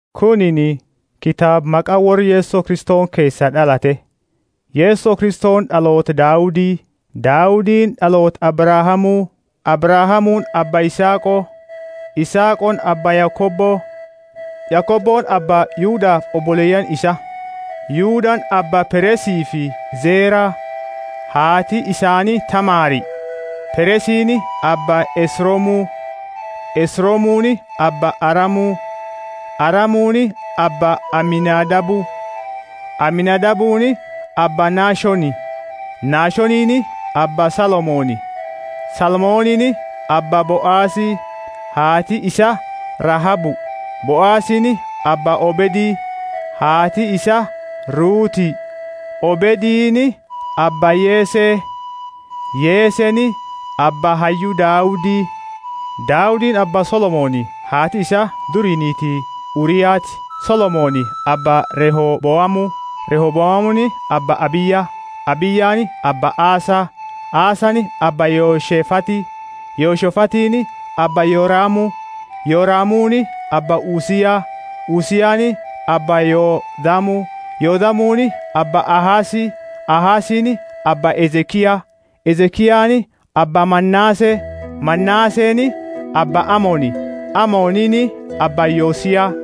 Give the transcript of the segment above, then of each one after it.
Kunini kitaaba maqa worra Yeso Kristoni keesaa d'alate. Yeso Kristoni d'aloota Daudi, Daudini d'aloota Abrahamu. Abrahamuuni abba Isaaqo; Isaaqoni abba Yakobo; Yakoboni abba Yudafi oboleyaani isaa. Yudani abba Peresifi Zera (haati isaani Tamari); Peresini abba Esromu; Esromuni abba Aramu; Aramuni abba Aminadabu; Aminadabuni abba Nashoni; Nashonini abba Salmoni; Salmonini abba Boazi (haati isaa Rahabu); Boazini abba Obedi (haati isaa Ruthi); Obedini abba Yese; Yeseni abba hayyu Daudi. Daudini abba Solomoni (haati isaa duri niiti Uriati); Solomoni abba Rehoboamu; Rehoboamuni abba Abiya; Abiyani abba Asa; Asani abba Yehoshefathi; Yehoshefathini abba Yoramu; Yoramuni abba Uzia; Uziani abba Yothamu; Yothamuni abba Ahazi; Ahazini abba Hezekia; Hezekiani abba Manase; Manaseni abba Amoni; Amonini abba Yosia;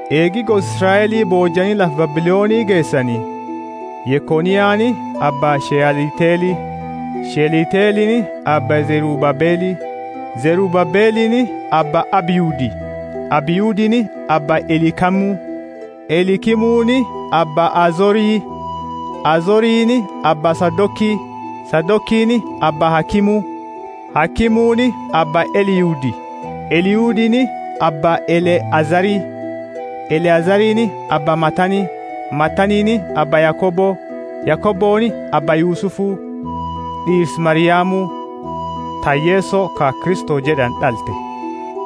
Eegi gosa Israeli boojiani lafa Babiloni geesani: Yekoniani abba Shealtieli; Shealtielini abba Zerubabeli; Zerubabelini abba Abihudi; Abihudini abba Eliakimu; Eliakimuni abba Azori; Azorini abba Sadoki; Sadokini abba Akimu, Akimuni abba Eliudi; Eliudini abba Eleazari; Eleazarini abba Matani; Matanini abba Yakobo; Yakoboni abba Yusufu, d'iirsa Mariamu, ta Yeso ka Kristo jed'ani d'alte.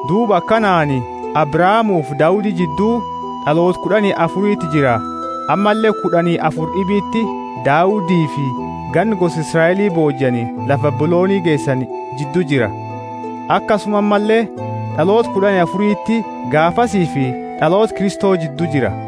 Duuba akanaani Abrahamufi Daudi jiddu d'aloota kud'ani afuriti jira ammalle kud'ani afuri d'ibiti Daudifi ganna gosa Israeli boojiani lafa Babiloni geesani jiddu jira, akasuma ammalle d'aloota kud'ani afuriti gaafasifi d'aloota Kristo jiddu jira.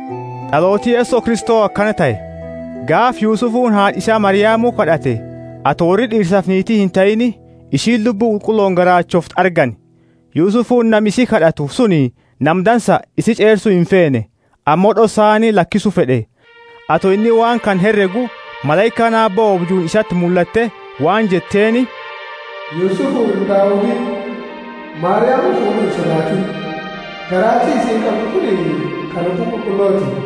D'alooti Yeso Kristo akana tahe. Gaafa Yusufuni haad'a isaa Mariamu kad'ate, ato worri d'iirsafi niiti intahiini, isi Lubbu Qulqullooni garaachoofte argani. Yusufuni, nami isi kad'atu suni, nama dansa, isi ch'eersu imfeene, ammo d'ossaani lakisu fed'e. Ato inni waan kana heregu, malaikaani Aabbo oobjuuni isati mullatte waan jetteeni, Yusufu, ilma Daudi, Mariamu fuud'u insodaatini. Garaachi isiini qabdu kunini ka Lubbu Qulqulloti.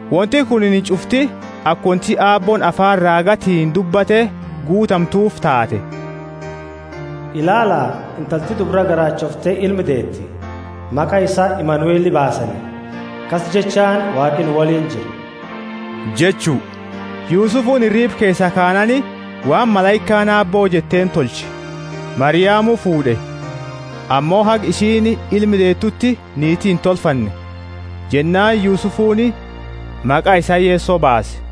Wonti kunini ch'ufti aka wonti Aabbooni afaani raagatiini dubbate guutamtufi taate: Ilaala, intalti dubra garaachoofte ilma deeti. Maqa isa Imanueli baasani. Akasi jechaani Waaqi nu woliini jira jechu. Yusufuni hiriiba keesaa kaanaani waan malaikaani Aabbo jetteeni tolche, Mariamu fuud'e. Ammo haga isiini ilma deetuti niiti intolfanne. Jennaani Yusufuni maqa isaa Yeso baase.